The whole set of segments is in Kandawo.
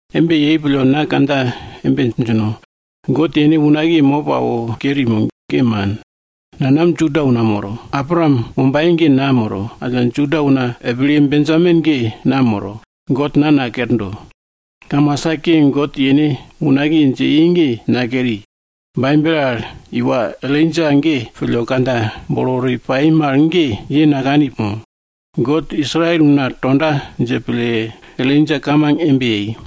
Embe yei pille, na kandja embe djindo, God yene unakiye mop awo keri mo? Ge man! Nanam Juda una moro. Abraam wombaye ge na moro, alla Juda una epilye Benjamin ge na moro. God na nakerdo. Kamasa ke God yene unakiye dje i ge, nakeri. Baibel al iwa Elaija ge pille kandja bolo wori pai mal ge, ye nakani mo? God Israel una tonda dje pille, Elaija kamang embe yei,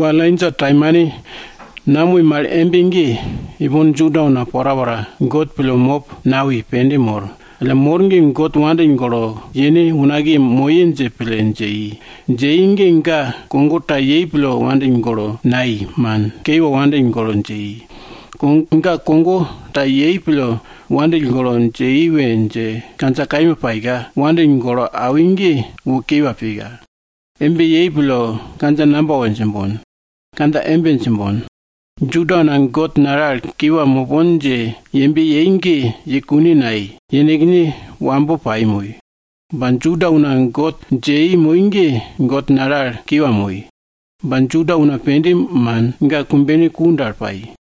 Iwa Elaija taimane namoi mal embe ge, ipon Juda una porapora God pille mop nawi, pende mor. Alla mor ge God wopake pille awo, yene unakiye moye dje pille dje i. Dje i ge ga kogo ta yei pille God wopake pille nawi, man. Kiwa wopake pille dje i. Ga kogo ta yepin pille God wopake pille dje i we djinj ge, kandja kaima paika, God nono wopake pille awi ge wo kiwa pika. Embe yei pille kandja namba we djimbon? Kandja embe djimbon. Juda una God nale al kiwa mopon dje yembe yei ge yei kune nayei. Yenekne wambo pai moi. Ba Juda una God dje i moi ge, God nale al kiwa moi. Ba Juda una pende man, ga kumbene ku dal pai.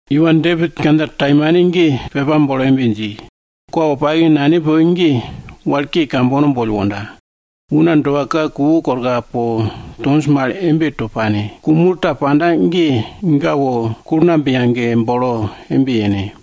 Iwa Depit kandja taimane ge pepa bolo embe dji, Kwa wopake nane poke ge wal ke kambono boll wonda. Una doa ka kuwo korka po tonj mal embe to pane. Ku mul ta panda ge, ga wo kulngamb yage bolo embe yene.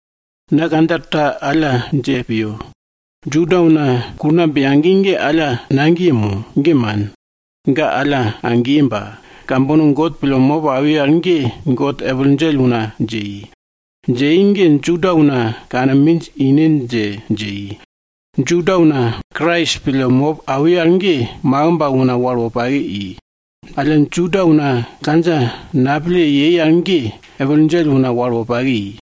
Na kandja ta alla dje piyo, Juda una kulngamb yagi ge, alla nagiye mo? Ge man! Ga alla agiye ba, kambono God pille mop awi al ge God epil djell una dje i. Dje i ge, Juda una kane minj ine dje, dje i. Juda una Krais pille mop awi al ge, makimb al una wal wopake i. Alla Juda una kandja napille yei al ge, epil djell una wal wopake i.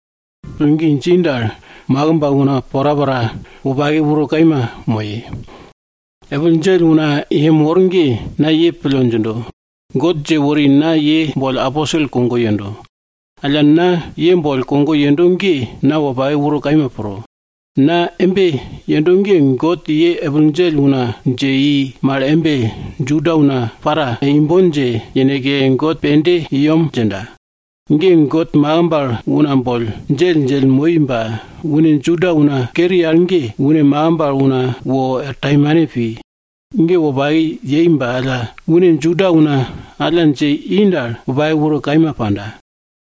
Ba alla Juda una Krais boll pillgi dji dal, makimb al una porapora wopake uro kaima moye. Epil djell una ye mor ge, na ye pille djindo. God dje wori na ye boll aposel kogo yendo. Alla na ye boll kogo yendo ge na wopake uro kaima pro. Na embe yendo ge, God ye epil djell una dje i mal embe, Juda una para imbon dje yeneke God pende i yem djinda. Ge God makimb al una boll djelldjell moi ba une Juda una keri al ge, une makimb al una boll wor taimane pi. Ge wopake yei ba alla, une Juda una alla dje i dal, wopake uro kaima panda.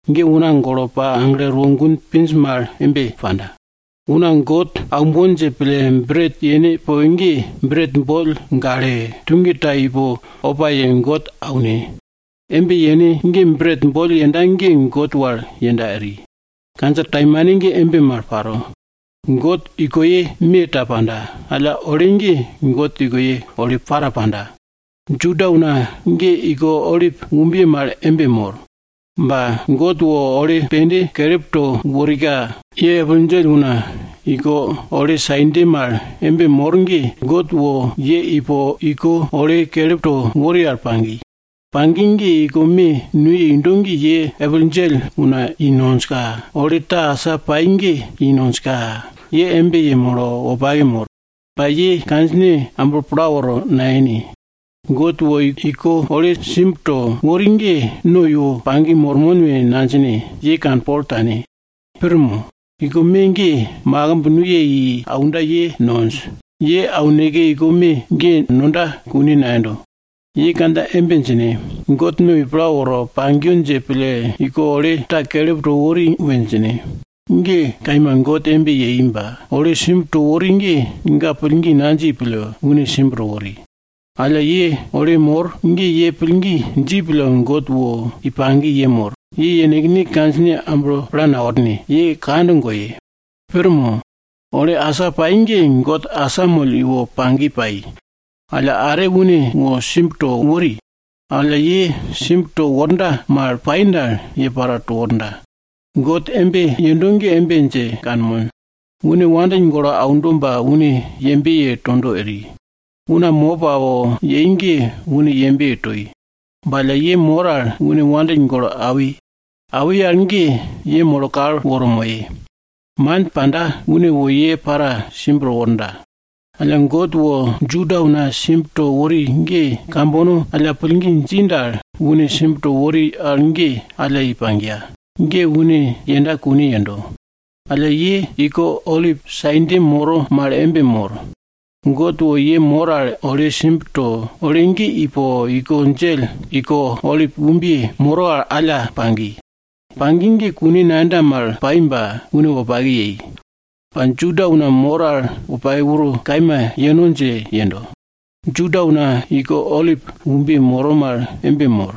Ge una golo pa aglo erwo gun pinj mal embe panda. Una God aumbon dje pille bret yene poke ge, bret boll gale, tuge ta ipo opa ye God aune. Embe yene ge bret boll yenda ge God wal yenda eri. Kandja taimane ge embe mal paro. God ikoye me ta panda, alla ole ge God ikoye ole para panda. Juda una ge iko olip umbiye mal embe mor. Ba God wo ole pende kelip to worika, ye epil djell una iko ole sainde mal embe mor ge, God wo ye ipo iko ole kelip to wori al pagi. Pagi ge iko me nuye indo ge ye epil djell i nonjka, ole ta asa pai ge i nonjka, ye embe yemolo wopake mor. Ba ye kandjine amblo pla woro nayene. God wo iko ole simb to wori ge no iwo pagi mormon we nadjine, ye kanpol tane, pir mo? Iko me ge makimb nuye i aunda ye nonj. Ye auneke iko me ge nonda kune nayendo. Ye kandja embe djine, God no i pla woro pagiyo dje pille iko ole ta kelip to wori we djine. Ge kaima, God embe yei ba, ole simb to wori ge, ga pillgi nadji pille, une simb to wori. Alla ye ole mor ge ye pillgi dji pille God iwo pagi yemor. Ye yenekne kandjine amblo pla naworne! Ye kand goye! Pir mo? Ole asa pai ge God asamoll iwo pagi pai. Alla are une wo simb to wori. Alla, ye simb tonda mal pai dal, ye para to worda. God embe yendo ge embe dje kanmon, une wandill golo aundo ba une yembe ye tondo eri. Una mop awo yei ge une yembe ye toi. Ba alla ye mor al une wandill golo awi. Awi al ge ye molo kal woro moye. Man panda, une wo ye para simb to worda. Alla God wo Juda una simb to wori ge, kambono alla pillgi dji dal, une simb to wori al ge alla i pagiya. Ge une yenda kune yendo. Alla ye iko olip sainde moro mal embe mor, God wo ye mor al ole simb to, ole ge ipo iko djell, iko olip umbiye moro al alla pagi. Pagi ge kune nayenda mal pai ba une wopake yei. Ba Juda una mor al wopake uro kaima yeno dje yendo. Juda una iko olip umbiye moro mal embe mor,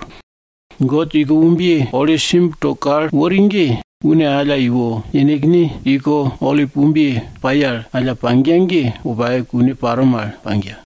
God iko umbiye ole simb to kal wori ge, une alla iwo yenekne iko olip umbiye pai al alla pagiya ge, wopake kune paro mal pagiya.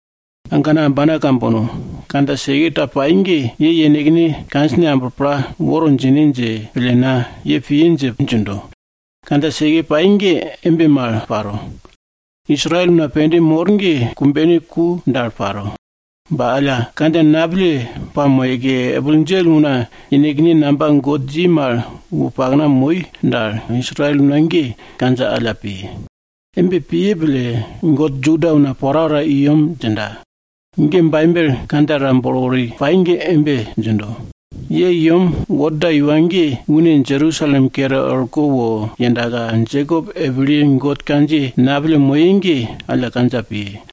Agana ambana kambono, kandja seke ta pai ge ye yenekne kandjine amblo pla woro djine dje pille na ye piye dje djindo. Kandja seke pai ge embe mal paro. Israel una pende mor ge kumbene ku dal paro. Ba alla kandja napille pamoyeke, epil djell una yenekne namba God dji mal wo pakna moi dal, Israel una ge kandja alla piye. Embe piye pille, God Juda una porapora i yem djinda. Baibel kandja ta bolo wori pai ge embe djindo, Ye i yem worda iwa ge une Jerusalem kere er orko wo yendaka, Jekop epilye God kandjiye napille moye ge, alla piye.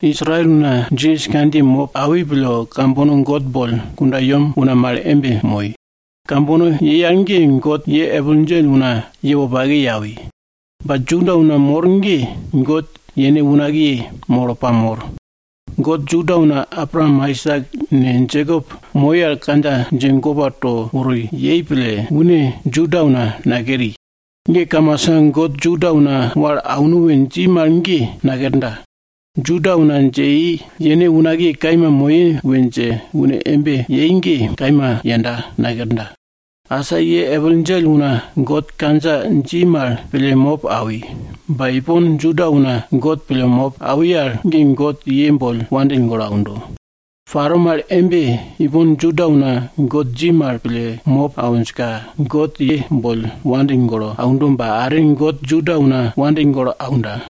Israel una Jisas kandjiye mop awi pille, kambono God boll kundayem una mal embe moi. Kambono yei al ge, God ye epil djell una ye wopake ye awi. Ba Juda una mor ge God yene unakiye molo pamor. God Juda una Abraam, Aisak ne, Jekop moi al kandja dje gopa to wori yei pille, une Juda una nakeri. Ge kamasa God Juda una wal auno we dji mal ge nakerda. Juda una dje i, yene unakiye kaima moye we dje une embe yei ge, kaima yenda, nakerda. Asa ye epil djell una God kandja dji mal pille mop awi, ba ipon Juda una God pille mop awi al ge, God ye boll wandill golo aundo. Paro mal embe, ipon Juda una God dji mal pille mop awinjka God ye boll wandill golo aundo ba, are God Juda una wandill golo aunda.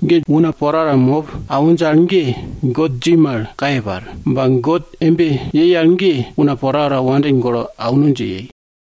Ge una porapora mop awinj al ge, God dji mal kaye par. Ba God embe yei al ge, una porapora wandill golo auno dje yei.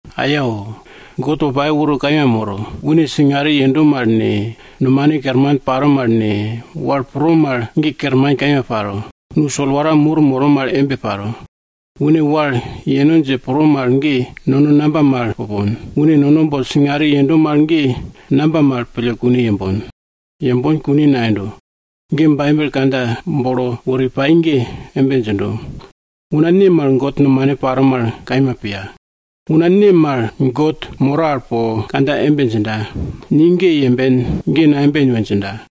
Ayao! God wopake uro kaima moro! Une singare yendo mal ne, nomane kerman paro mal ne, wal pro mal ge kerman kaima paro. Nu solwara mur moro mal embe paro. Une wal yeno dje pro mal ge, nono namba mal pupon? Une nono boll singare yendo mal ge, namba mal pille kune yembon? Yembon kune nayendo! Baibel kandja bolo wori pai ge embe djindo, Una ne mal God nomane paro mal, kaima piya? Una ne mal God moro al po kandja embe djinda, ni ge yemben, ge nayemben we djinda?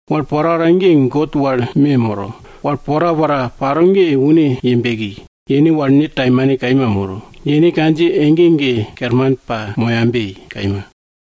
Wal porapora ge God wal me moro. Wal porapora paro ge une ye beki, yene wal ne taimane kaima moro. Yene kandjiye ege ege kerman pamoyabe. Kaima.